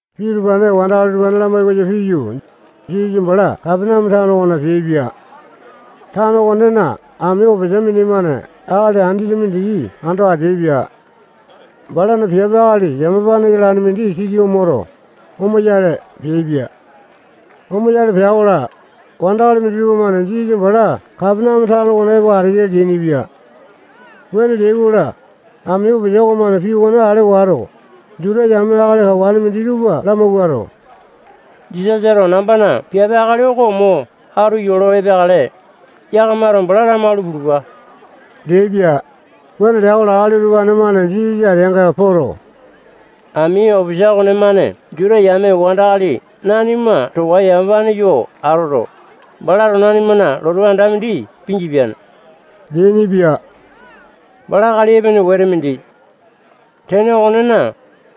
Pii utupane wandakali tupa lamai koyo piyu, Jisasa bala Kapaneame tano okona peaipia. Tano okonena ami opisa mindimane akali andete mindiki ando ateaipia. Balana piape akali yamapane yalane mindi siki moto, omoyale peaipia. Omoyale pea-kola, wandakali minditupa-mane Jisasa bala Kapaneame tano okona epo ateya leainipia. Wuane leai-kola, ami opisa okomane pii okone ale wato, Juta yame akali kawane minditupa lamawuato, Jisasato nambana piape akali oko mo atu yolo epeakale, yakamato bala lamalu pulupa leaipia. Wuane lea-kola, akali utupane-mane Jisasa ateanga poto, ami opisa okonemane Juta yame wandakali nanima towa yamapane yo atoto, balato nanimana lotu anda mindi pingipiane leainipia. Bala akali epene wete mindi. Tene okonena,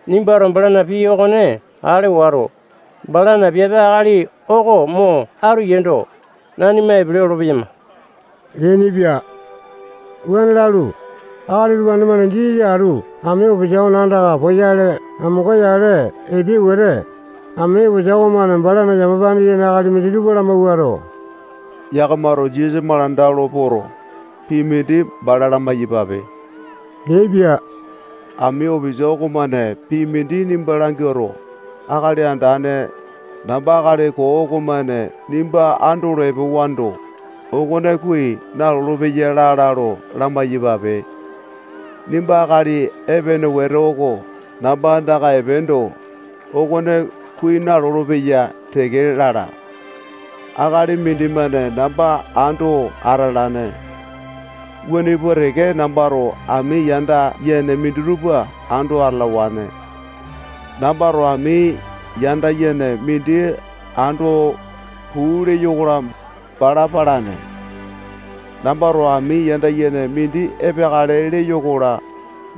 nimbato balana pii okone ale wato, balana piape akali oko mo atu yeendo, nanima epele olopeyama leainipia. Wuane lalu, akali utupane-mane Jisasa atu ami opisa okona andaka poyale amonga-yale epeai wete, ami opisa okomane balana yamapane yene akali minditupa lamawuato, yakamato Jisasa malanda olo poto, pii mindi bala lamai-yapape leaipia. Ami opisa okomane pii mindi nimba languato, Akali Andane, namba akali koo okomane nimba andolo epewando, okone kuai nalolo-peya lala lo lamai-yapape. Nimba akali epene wete oko namba andaka epeendo, okone kuai nalolo-peya teke lala. Akali mindimane namba ando atalane. Wuane pua teke nambato ami yanda yene minditupa ando atalawane. Nambato ami yanda yene mindi ando, puu leyo-kola, bala palane. Nambato ami yanda yene mindi epeakale leyo-kola,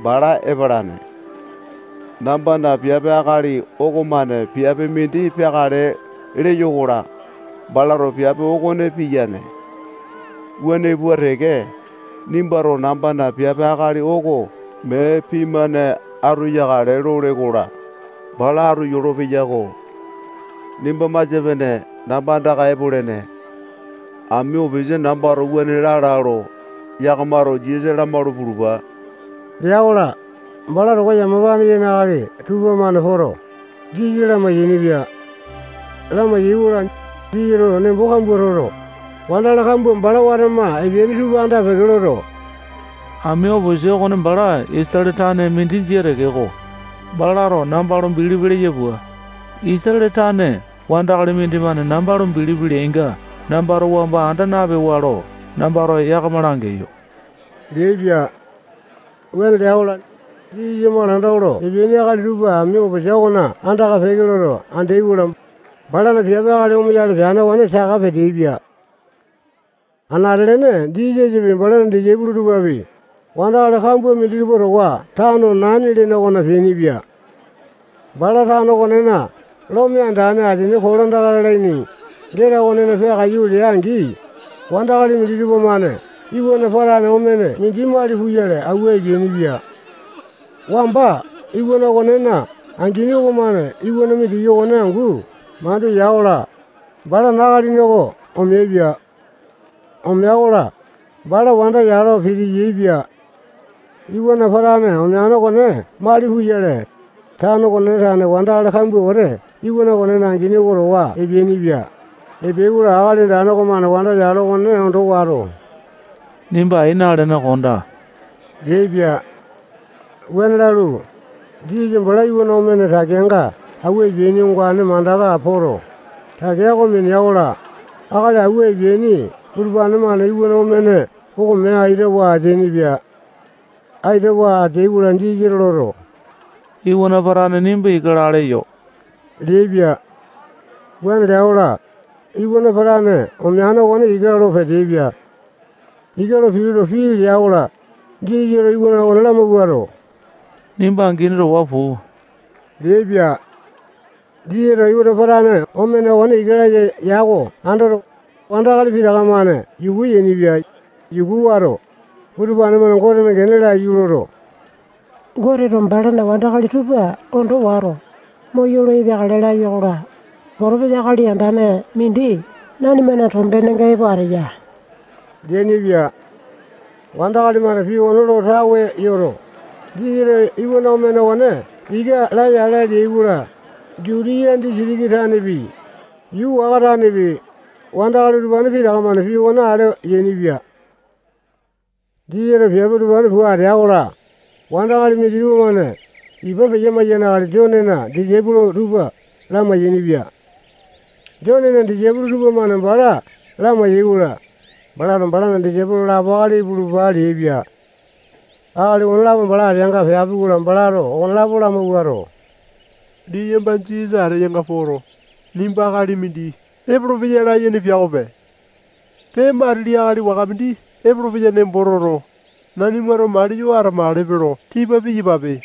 bala epalane. Nambana piape akali okomane piape mindi peakale leyo-kola, balato piape okone piyane. Wuane pua teke, nimbato nambana piape akali oko mee pii-mane atu yakale lole-kola, bala atu yolopeya-ko. Nimba masia-pene namba andaka epolene. Ami opisa nambato wuane lala lo, yakamato Jisasa lamalu pulupa lea-kola, bala towa yamapane yene akali tupamane poto, Jisasa lamai-yainipia. Lamai-yaikola, Jisasato nembo kambua toto, wandakali kambua bala watama epeaini tupa anda-peke loto, ami opisa okone bala Isatale tane mindi jia tekeko, balato namba bilipi leya pua, Isatale tane wandakali mindimane namba bilipi leainga nambato wamba anda napewane lo nambato yakama langeyo leaipia. Wuane lea-kola, Jisasa malanda olo epeaini akali tupa ami opisa okona andaka peke loto andeai-kola, balana piape akali omoyale peane okone saka peteaipia. Anate-lene Jisasapi, balana disaipolo tupapi, wandakali kambua minditupa towa tano Naini lene okona peainipia. Bala tano okonena lome andane asini kolandaka lalaini geta okona peakaiyu lea-angi, wandakali minditupa-mane iwana patane omene mindi mali puyale awua epeainipia. Wamba iwana okonena angini okomane iwana mindiki okone angu mandu ya-kola, balana akalini oko omeaipia. Omea-kola, bala wanda yalo piti-yaepia. Iwana patane omeane okone mali puyale, tano okonena tane wandakali kambua wete iwana okonena angini oko towa epeainipia. Epeai-kola, Akali Andane okomane wanda yalo okone ondo wato, nimba ai nalene kondaa leaipia. Wuane lalu, Jisasa bala iwana omene takeanga awua epeaini ongane mandaka poto, takea oko minea-kola, akali awua epeaini utupane-mane iwana omene oko mee aitawa ateainipia. Aitawa ateai-kola, Jisasato loto, iwana patane, nimba ika laa leyo leaipia. Wuane lea-kola, iwana patane omeane okone ika lo peteaipia. Ika lo pituto, pii lea-kola, Jisasato iwana okone lamawuato, nimba angini towa puu leaipia. Jisasato iwana patane omene okone ika laya ya oko andoto, wandakali pitaka-mane yuku yainipia. Yuku wato, utupane-mane Gotena gene oko laiyu loto, Goteto balana wandakali tupa ondo wato, moyolo epeakale lapia-kola, potopesa akali andane mindi nanimana tombenenga epo ateya leainipia. Wandakali-mane pii okone lo tawe yoto, Jisasato iwana omene okone ika laya ala leai-kola, Jutiya disitiki tanepi, yuu waka tanepi, wandakali utupane pitaka-mane pii okone ale yainipia. Jisasato piape utupane pua ateya-kola, wandakali mindimane ipa peya-maiyane akali Jonena disaipolo tupa lamai-yainipia. Jonena disaipolo tupamane bala lamai-yaikola, balato balana disaipolo lapo akali ipulupa leaipia. Akali okonelapo bala ateanga peapi-kola, balato okonelapo lamawuato, liyamba Jisasa ateyanga poto, nimba akali mindi epolopeya layene pia okope. Pee, matili akali waka mindi epolopeya nembo toto, nanimato maliyo atamakalepe lo tipa piyapape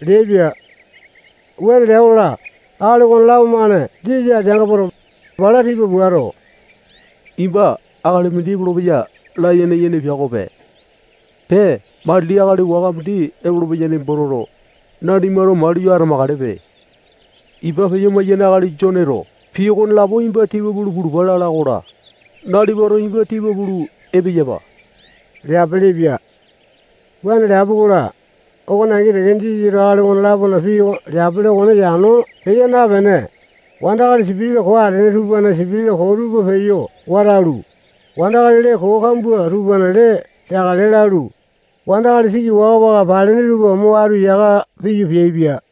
leaipia. Wuane lea-kola, akali okonelapo-mane Jisasa ateanga poto, bala tipa puato, nimba akali mindi epolopeya layene yene pia okope. Pee, matili akali waka mindi epolopeya nembo toto, nanimato maliyo atamakalepe. Ipa peya-maiyane akali Jone pii okonelapo nimba tipa pulu pulupa lala-kola, nalipato nimba tipa pulu epeyapa leapelepia. Wuane leapi-kola, okone angi teke Jisasato akali okone-lapona pii leapele okone yano peya napene, wandakali sipitisa koo atene tupana sipitisa koo tupa peyo watalu, wandakali lee koo kambua tupana lee teakale lalu, wandakali siki waka-waka palene tupa mo atu yaka piyu, peaipia.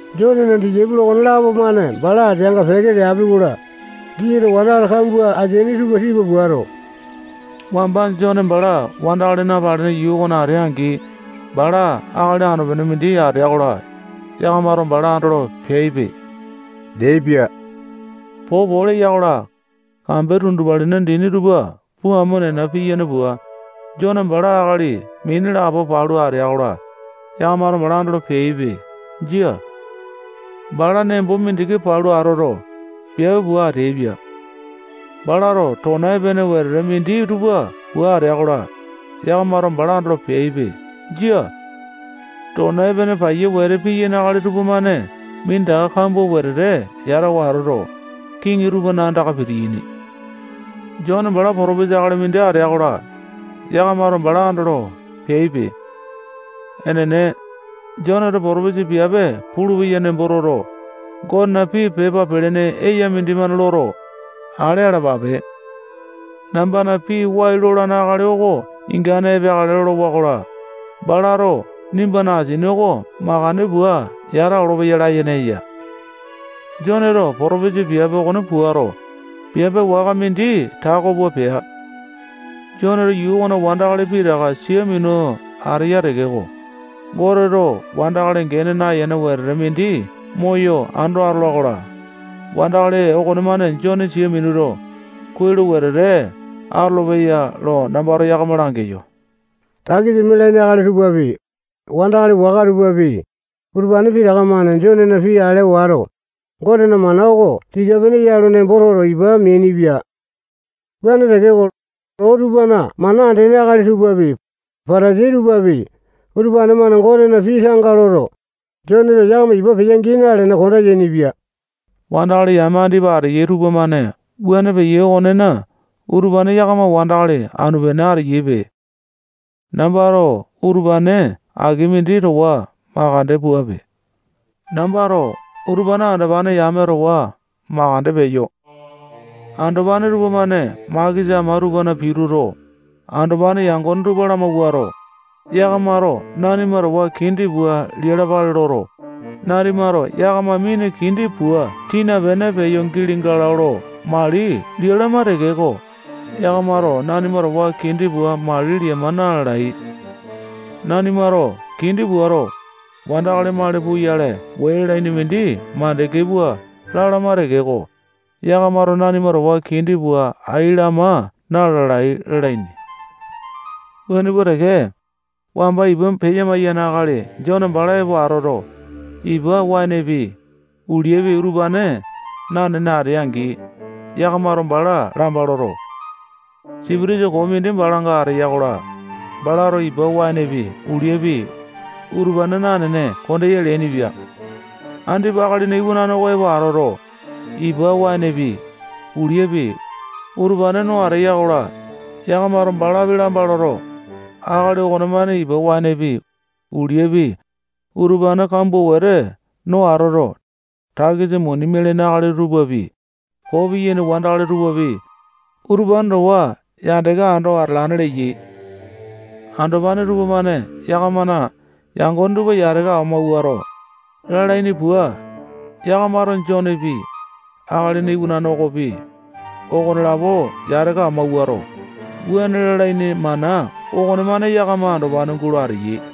Jonena disaipolo okonelapo-mane bala ateanga peke leapi-kola, Jisasato wandakali kambua ateaini tupa tipa puato, wamba Jone bala wandakali napalene yuu okona atea-angi, bala akali anu-pene mindi atea-kola, yakamato bala andolo peaipe leaipia. Popo leya-kola, kambe tundupalina dini tupa puu amo nena piyane pua, Jone bala akali mini lapo palu atea-kola, yakamato bala andolo peaipe. Jia. Bala nembo mindiki palu atoto, piape pua ateaipia. Balato tona epene wete minditupa pua atea-kola, yakamato bala andolo peaipe. Jia. Tona epene paiya wete piyaini akali tupamane minditaka kambua wetete yatawa atoto, kiŋi tupana andaka pitiyaini. Jone bala potopesa akali mindi atea-kola, yakamato bala andolo peaipe. Enene. Joneto potopisa piape pulupeya nembo toto, Gotena pii pepa pelene eya mindimane loto, ale alapape. Nambana pii wai lolane akali oko ingane epeakale lolowa-kola, balato nimbana asini oko makande pua yata olopeya layene eya. Joneto potopesa piape okone puato, piape waka mindi tako pua pea. Joneto yuu okona wandakali pitaka sia minu ateya tekeko, Goteto wandakali gene nayene wetete mindi moyo ando atola-kola, wandakali okonemane Jone sia minuto, kuai lo wetete atolopeya lo nambato yakama langeyo. Takisa mialaini akali tupapi, wandakali waka tupapi, utupane pitaka-mane Jonena pii ale wato, Gotena mana oko tika-pene ya lo nembo toto, ipa meainipia. Wuane tekeko, loo tupana mana andene akali tupapi, Patasai tupapi, utupane-mane Gotena pii tanga loto, Joneto yakama ipa peya-gii nalene, konda yainipia. Wandakali yame andipa ateyai tupamane wuane peyai okonena, utupane yakama wandakali anu-pene ateyaipe. Nambato utupane aki mindi towa makande puape. Nambato utupane andopane yame towa makande peyo. Andopane tupamane makesa ama tupana pituto, andopane yangone tupa lamawuato, yakamato nanima towa kindi pua lialapale loto, nanimato yakama mina kindi pua tina pene peyo gili galo lo mali lialama tekeko, yakamato nanima towa kindi pua mali liama na-lalai. Nanimato kindi puato, wandakali mali puyale wee lalaini mindi mandeke pua lalama tekeko, yakamato nanima towa kindi pua ai lama na-lalai lalaini. Wuane pua teke, wamba ipa peya-maiyane akali Jone bala epo atoto, ipa waenepi, uliapi, utupane nanene atea-angi, yakamato bala lamba loto, sipitisa koo mindi balanga ateya-kola, balato ipa waenepi, uliapi, utupane nanene kondeya leainipia. Andipa Akalina Iwanane oko epo atoto, ipa waenepi, uliapi, utupane no ateya-kola, yakamato balapi lamba loto, akali okomane ipa waenepi, uliapi, utupane kambua wete no atoto, takisa muni mialaini akali tupapi, koo piyaini wandakali tupapi, utupane towa yandeke ando atalane leyai. Andopane tupamane yakamana yangone tupa yataka amauwato, lalaini pua, yakamato Jonepi, Akalina Iwanane okopi, okonelapo yataka amawuato, wuane lalaini mana okonemane yakama andopane gulo ateyai.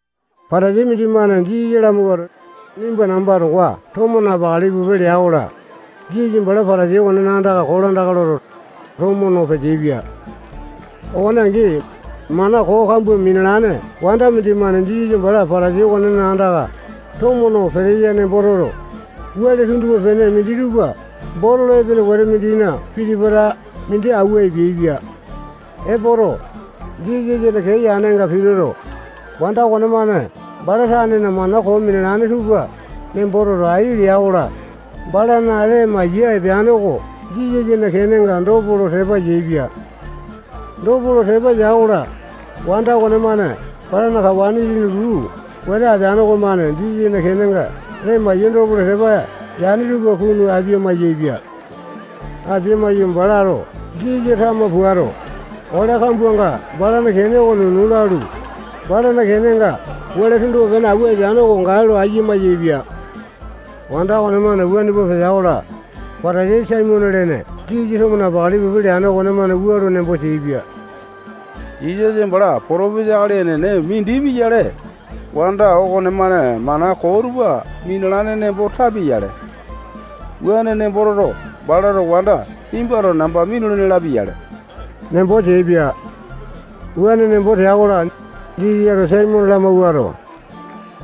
Patasai mindimane Jisasa lamawuato, nimba namba towa tomo napakale ipu lea-kola, Jisasa bala Patasai okona andaka kolandaka loto, tomo no peteaipia. Okone angi, mana koo kambua minalane wanda mindimane Jisasa bala Patasai okonena andaka tomo no peteya nembo toto, wele tunduma-pene minditupa botolo epene wete mindina piti-pata mindi awua epeaipia. Epoto, Jisasana kee yanenga pituto, wanda okonemane bala tanena mana koo minalane tupa nembo toto, ai lea-kola, balana lee maiya epeane oko Jisasana kenenga dopo lo tepa yaepia. Dopo lo tepa ya-kola, wanda okonemane balana kawa itini luu wete atene okomane Jisasana kenenga lee maiya dopo lo tepa yane tupa kunu apia-maiyaepia. Apia maiyu, balato Jisasa tama puato, ole kambuanga balana kene oko nunu lalu, balana kenenga wele tunduma-pene awua epeane oko gae lo ayia mayaepia. Wanda okonemane wuane pua petea-kola, Patasai Saimone lene Jisasa tomo napakale ipu leane okomane wua lo nembo teaipia: Jisasa bala potopesa akali enene mindi pia-yale, wanda okonemane mana koo tupa minalane nembo tapia-yale. Wuane nembo toto, balato wanda nimbato namba minulene lapia-yale nembo teaipia. Wuane nembo tea-kola, Jisasato Saimone lamawuato,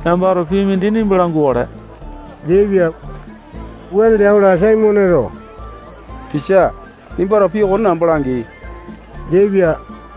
nambato pii mindi nimba langukale leaipia. Wuane lea-kola, Saimoneto tisa, nimbato pii okone namba langi leaipia.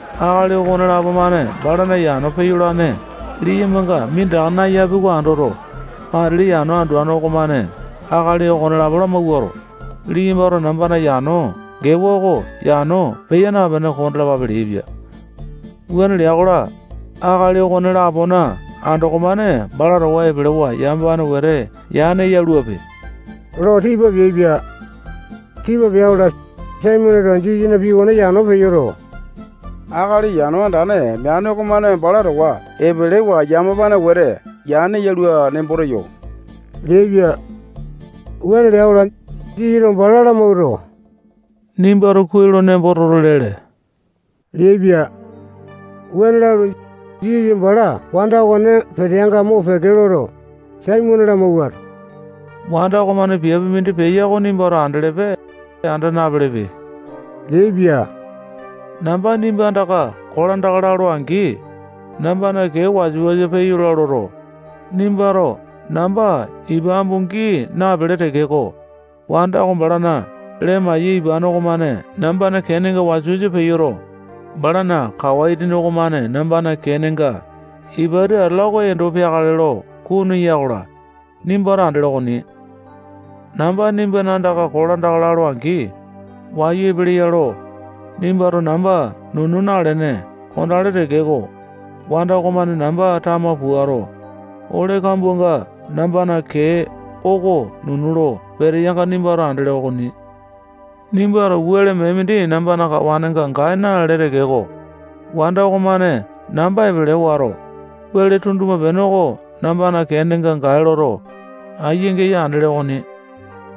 Akali okonelapo-mane balana yano peyolane liyambanga minditaka nayapi oko andoto, matili yano anduane okomane akali okonelapo lamawuato, liyambato nambana yano gewa oko yano peya napene kondalapape leaipia. Wuane lea-kola, akali okone-lapona andoko-mane bala towa epelewa yamapane wete yane yaluape lo tipa peaipia. Tipa pea-kola, Saimoneto Jisasana pii okone yano peyoto, akali yano andane meane okomane bala towa epelewa yamapane wete yane yalua nembo teyo leaipia. Wuane lea-kola, Jisasato bala lamawuato, nimbato kuai lo nembo toto, lele leaipia. Wuane lalu, Jisasa bala wanda okone peteanga mopeke loto, Saimone lamawuato, wanda okomane piape mindi peya oko nimbato andelepe, anda napelepe leaipia. Namba nimba andaka kolandaka lalo-angi, nambana kee wasa-wasa peyola loto, nimbato namba ipa ambua gii napele tekeko, wanda oko balana lee maiya ipane okomane nambana keenga wasa-wasa peyoto, balana kawa itini okomane nambana kenenga ipati atala oko endo peakale lo kunu eya-kola, nimbato andele okoni. Namba nimbana andaka kolandaka lalo-angi, wayu epeleya lo, nimbato namba nunu nalene kondele tekeko, wanda okomane namba tama puato, ole kambuanga nambana kee oko nunu lo peteyanga nimbato andele okoni. Nimbato wele mee mindi nambana kawanenga gae na-lale tekeko, wanda okomane namba epele wato, wele tunduma-pene oko nambana kenenga gae loto, aiya-geya andele okoni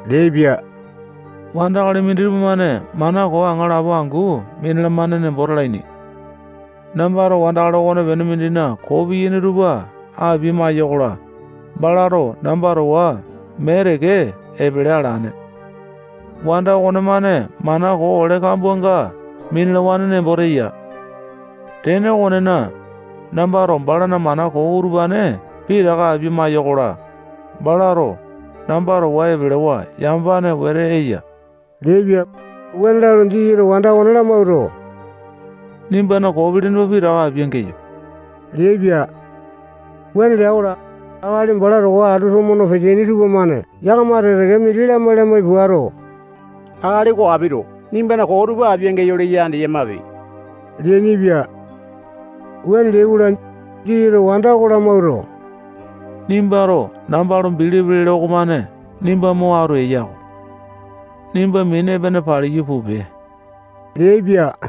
leaipia. Wandakali minditupa-mane mana koo aŋalapo angu minalamane nembo talaini. Nambato wandakali okonepene mindina koo piyane tupa apia-maiyokola, balato namba towa mee teke epele alane. Wanda okonemane mana koo ole kambuanga minalawane nembo teya. Tene okonena, nambato balana mana koo utupane pitaka apia-maiyokola, balato namba towa epelewa yamapane wete eya leaipia. Wuane lalu, Jisasato wanda okone lamawuato, nimbana koo pilini tupa pitaka apia-geyo leaipia. Wuane lea-kola, akali bala towa atu tomo no peteaini tupamane yakama teke-teke mindi lamai-lamai puato, akali oko apito nimbana koo tupa apia-geyo leya andeyamape leainipia. Wuane leai-kola, Jisasato wanda oko lamawuato, nimbato namba lo bilipi lele okomane nimba mo atu eya-ko. Nimba mini epene paliyu pupe leaipia.